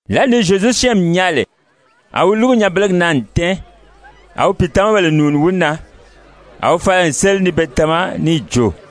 Lǎli ni Zyezu syɛ́ɛnmi nyaa lè, a wi lúgu nyanbelegi na n tɛ́ɛn. A wi pìitamabèle nùuni wi na. A wi fala n séli ni be tama níì jo: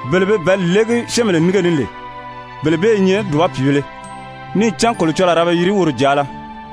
Bele be bɛ̀ɛ́li légi syɛ́ɛnbèle nínge ni lè, bele bee i nyɛ dùba pìibēle, níì cán Kolocɔlɔɔ a ra be yiri woro jàala!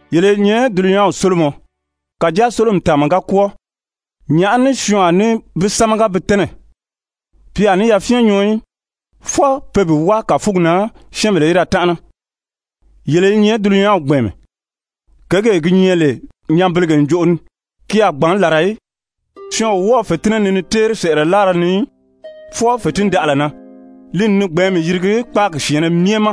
«Yele i nyɛ dulunyanw sólomɔ, kàjáa sólomi tàanma ga kwɔ́ɔ, nyàʔá ní syɔɔn a ní bi sámaga bi tɛ́nɛ? Pi a ní yafyɛn nyɔɔ í, fwɔɔ pe bi wáa kàfugi na syɛ́ɛnbèle í da tánʔana. Yele i nyɛ dulunyanw gbɛ̀ɛnmɛ. Kěgee gi nyɛ lè nyanbelege ǹjoʔo ni, ki a gbǎn làra í. Syɔɔn o wɔ́ɔ̄ fètinnɛ nii ni téeri sɛ̀ʔɛlɛ láara ni í, fwɔɔ fètindaʔala na, li n ni gbɛ̀ɛ́nmi yirigi kpáagi syɛ̀ɛnnɛ myɛ ma.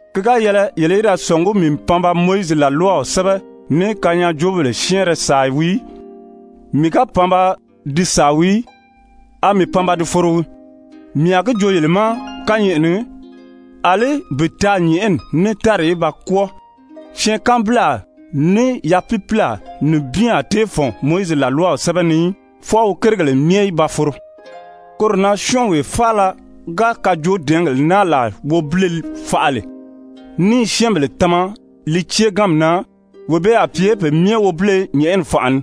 «Ki ga yɛlɛ yele í da sɔ̀ngí mii n pan ba Mowizi làlwaw sɛ́bɛ, ní kanyaajoobèle syɛ́ɛnrɛ sàa wii í. Mii ga pan ba di sàa í, a mii pan ba di foro wii. Mii a gi joo yele ma kányɛʔɛ ni, àlí bi taa nyɛ̀ʔɛni ní tári í ba kwɔ́ɔ, syɛɛnkanbilaa ní yapiipiilaa nibin a tée fɔ̀n Mowizi làlwaw sɛ́bɛ ni í, fwɔɔ wi kérigèle myɛ í ba foro. Koro na syɔ́ɔnwee faala ga kajoodɛɛngèle naa làa wobile faʔa lè, ní i syɛ́ɛnbèle tama li céeganmi na, wee bee a pye pe myɛ wobile nyɛ̀ʔɛni fànʔa ni.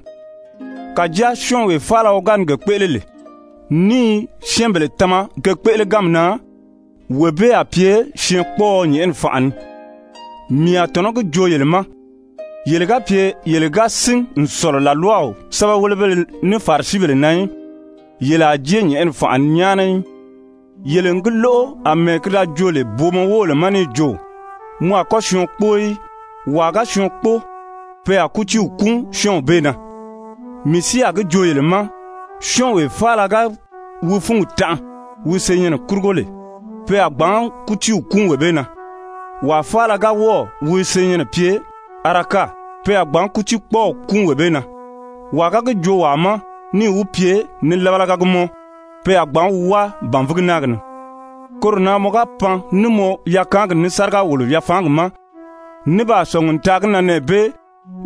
Kàjáa syɔ́ɔnwee faala wi ga ni ge kpéʔele lè, ní i syɛ́ɛnbèle tama ge kpéʔeleganmi na, wee bee a pye syɛɛnkpɔɔɔ nyɛ̀ʔɛni fànʔa ni. Mii a tɔ̀nɔ gi joo yele ma, yele ga pye yele ga sín n sɔ̀lɔ làlwaw sɛ́bɛwelebéle ní Farisibèle na í, yele a jée nyɛ̀ʔɛni fànʔa ni nyáana í. «Yele n gi lóʔo àmɛɛ ki da joo lè booma wóbèle ma níì jo: ‹Mɔ a kɔ́ syɔɔn kpóo í. Wàa ga syɔɔn kpóo, pe a kútiiw kúun syɔ́ɔnw bee na.› Mii si a gi joo yele ma, syɔ́ɔnwee faala ga wi fúngi tanʔa wi senyɛnnɛ kurugo lè, pe a gbǎn kútiiw kúun wee bee na. Wàa faala ga wɔ́ɔ̀ wi senyɛnnɛ pye: ‹Araka,› Araka: Mɔ ga lóʔo Araka, ki kɔ́rɔw wii, gbanzan syɔ́ɔn. pe a gbǎn kútiikpɔɔw kúun wee bee na. Wàa ga gi joo wàa ma níì wi pye: ‹Nilabalaga gii mɔ,› pe a gbǎn wi wáa bànvigi náagi ni. Koro na mɔ ga pan ní mɔ yakaangi ní sáriga-wòlo-yafaangi ma, ní baa sɔ̀ngi n taa gi na nɛɛ bee,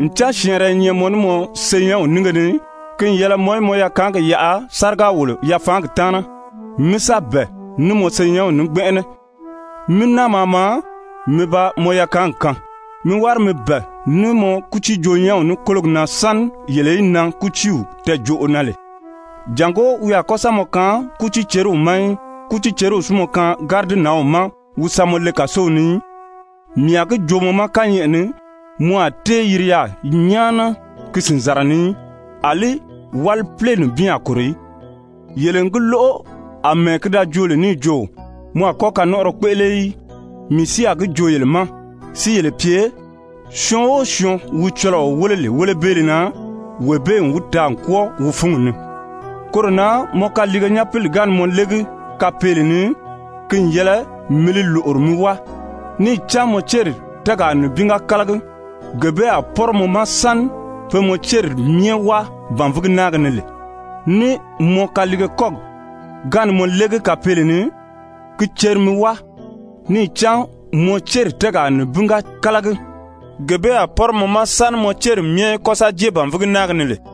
ncan syɛɛnrɛ i nyɛ mɔ ní mɔ senyɛnw nínge ni, ki n yɛlɛ mɔ í mɔ yakaangi yaʔa yaà sáriga-wòlo-yafaangi taana, mí sa bɛ̀ɛ ní mɔ senyɛnw ní gbɛnʔɛnɛ, mí náa maa maa mi ba mɔ yakaangi kaan. Mi wári mi bɛ̀ɛ ní mɔ kútiijoo-nyɛ́nw ní kólogi na sáni yele í nan kútiiw tɛɛjoʔo na lè, jàngó wi a kɔ́ sa mɔ kaan kútiiceriw ma í, kútiiceriw si mɔ kaan gáridinanw ma wi sa mɔ le kàsow ni í. Mii a gi joo mɔ ma kányɛʔɛ ni, mɔ a tée yiri yaà nyáana ki sìnzara ni í, àlí wálipile nibin a kòro í. «Yele n gi lóʔo, àmɛɛ ki da joo lè níì jo: ‹Mɔ a kɔ́ kanɔnʔɔrɔ kpéʔele í.› Mii si a gi joo yele ma si yele pye, syɔɔn o syɔɔn wi cɔlɔɔ wéle lè wélebeele na, wee bee n wi taa n kwɔ́ɔ wi fúngi ni. Koro na mɔ kaliige nyapili ga ni mɔ légi kapeele ni, ki n yɛlɛ mi li lòʔori mi wáa. Níì cán mɔ céri tɛ́ɛgaa nibin ga kálagi, gee bee a pɔ́rɔ mɔ ma sáni pe mɔ céri myɛ wáa bànvigi náagi ni lè. Ní mɔ kaliige kɔ́gi ga ni mɔ légi kapeele ni, ki ceri mi wáa. Níì cán mɔ céri tɛ́ɛgaa nibin ga kálagi, gee bee a pɔ́rɔ mɔ ma sáni mɔ céri myɛ í kɔ́ sa jée bànvigi náagi ni lè.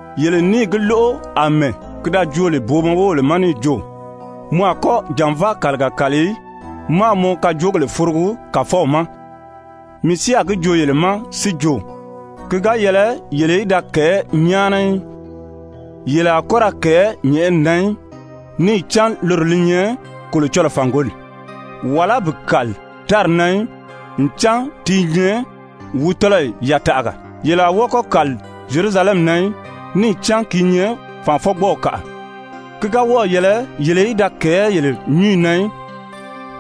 «Yele n níì gi lóʔo àmɛɛ ki da joo booma wóbèle ma lè níì jo: ‹Mɔ a kɔ́ jànvaa kàliga kàli í, máā mɔ kajoogèle forogi Kàfɔw ma.› Mii si a gi joo yele ma si jo, ki ga yɛlɛ yele í da kɛ̀ɛ́ nyáana í. Yele a kɔ́ ra kɛ̀ɛ́ nyɛ̀ʔɛni na í, níì cán loro li nyɛ Kolocɔlɔɔ fàngoli. Wàlá bi kàli ‹tári na í, ncan ti i nyɛ wi tɔ́lɔyi yataʔaga.› Yele a wɔ́ɔ kɔ́ kàli Zyerusalɛmi na í, níì cán ki i nyɛ ‹Fànʔafɔgbɔɔw kàʔa.› Ki ga wɔ́ɔ̀ yɛlɛ yele í da kɛ̀ɛ́ yele nyúnyi na í,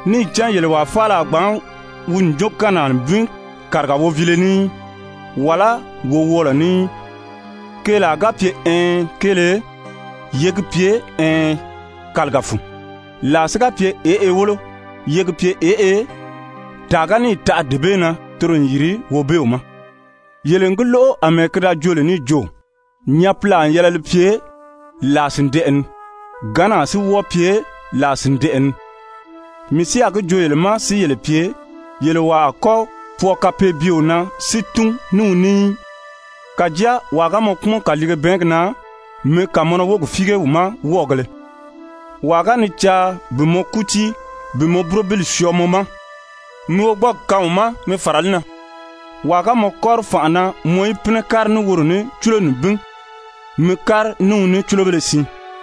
níì cán yele wàa faala a gbǎn wi ǹjookannaa nibin kàriga woviile ní í, wàlá wowɔɔlɔ ní í. Keelaa ga pye ɛɛn kéele, ye gi pye ɛɛn kàliga fun. Làa si ga pye ěʔe wólo, ye gi pye ěʔe. Tàa ga níì taʔa dee bee na, toro n yìri Wobeew ma. «Yele n gi lóʔo àmɛɛ ki da joo lè níì jo: ‹Nyapilaa n yɛlɛ li pye làa sìndɛʔɛ ni. Gǎnnaa si wɔ́ɔ pye làa sìndɛʔɛ ni.› Mii si a gi joo yele ma si yele pye, yele wàa a kɔ́ pwɔɔ kapeebyeo na si tún ní wi ní í. Kàjáa wàa ga mɔ kpúmɔn kàliige bɛɛngi na, mi kàmɔnɔ wógi fíige wi ma wɔ́ɔgēle. Wàa ga ni caa bi mɔ kútii bi mɔ burobili syɔɔ mɔ ma, mi wogbɔɔgi kaan wi ma mi fàra li na. Wàa ga mɔ kɔ́ri fànʔa na mɔ í pínɛ kári ní woro ní cúlo nibin, mi kári ní wi ní cúlobéle siin.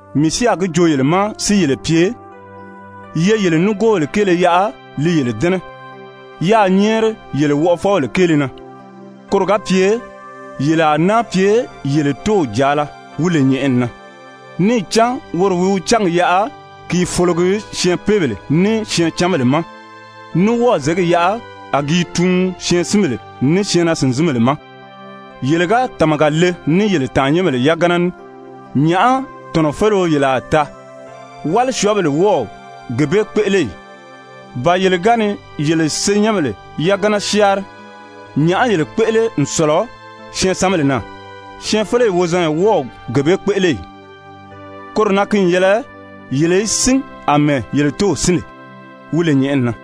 Mii si a gi joo yele ma si yele pye, ye yele nigoobèle kéele yaʔa li yele dɛ́nɛ, yáā nyɛ́ɛri yele wɔʔɔfɔbèle kéele na. Koro ga pye yele a náa pye yele Tóow jàala wi lè nyɛ̀ʔɛni na. Níì cán woro wi wi cángi yaʔa a gi i fologi syɛɛnpeebèle ní syɛɛncanbèle ma, ní wɔ́ɔ̀ zěgi yaʔa a gi i tuun syɛɛnsinbèle ní syɛɛnnaa-sìnzinbèle ma. Yele ga tàmaga le ní yele tàannyɛnbèle yagana ní, nyàʔá tɔ̀nɔfeleo yele a taa? Wálisyɔɔbèle wɔ́ɔ o gee bee kpéʔele ì? Ba yele ga ni yele senyɛnbèle yagana syáanri, nyàʔá yele kpéʔele n sɔ̀lɔ syɛɛnsanbèle na? Syɛɛnfeleyi wozanya wɔ́ɔ o gee bee kpéʔele ì? Koro na ki n yɛlɛ yele í sín àmɛɛ yele Tóow sín lè, wi lè nyɛ̀ʔɛni na.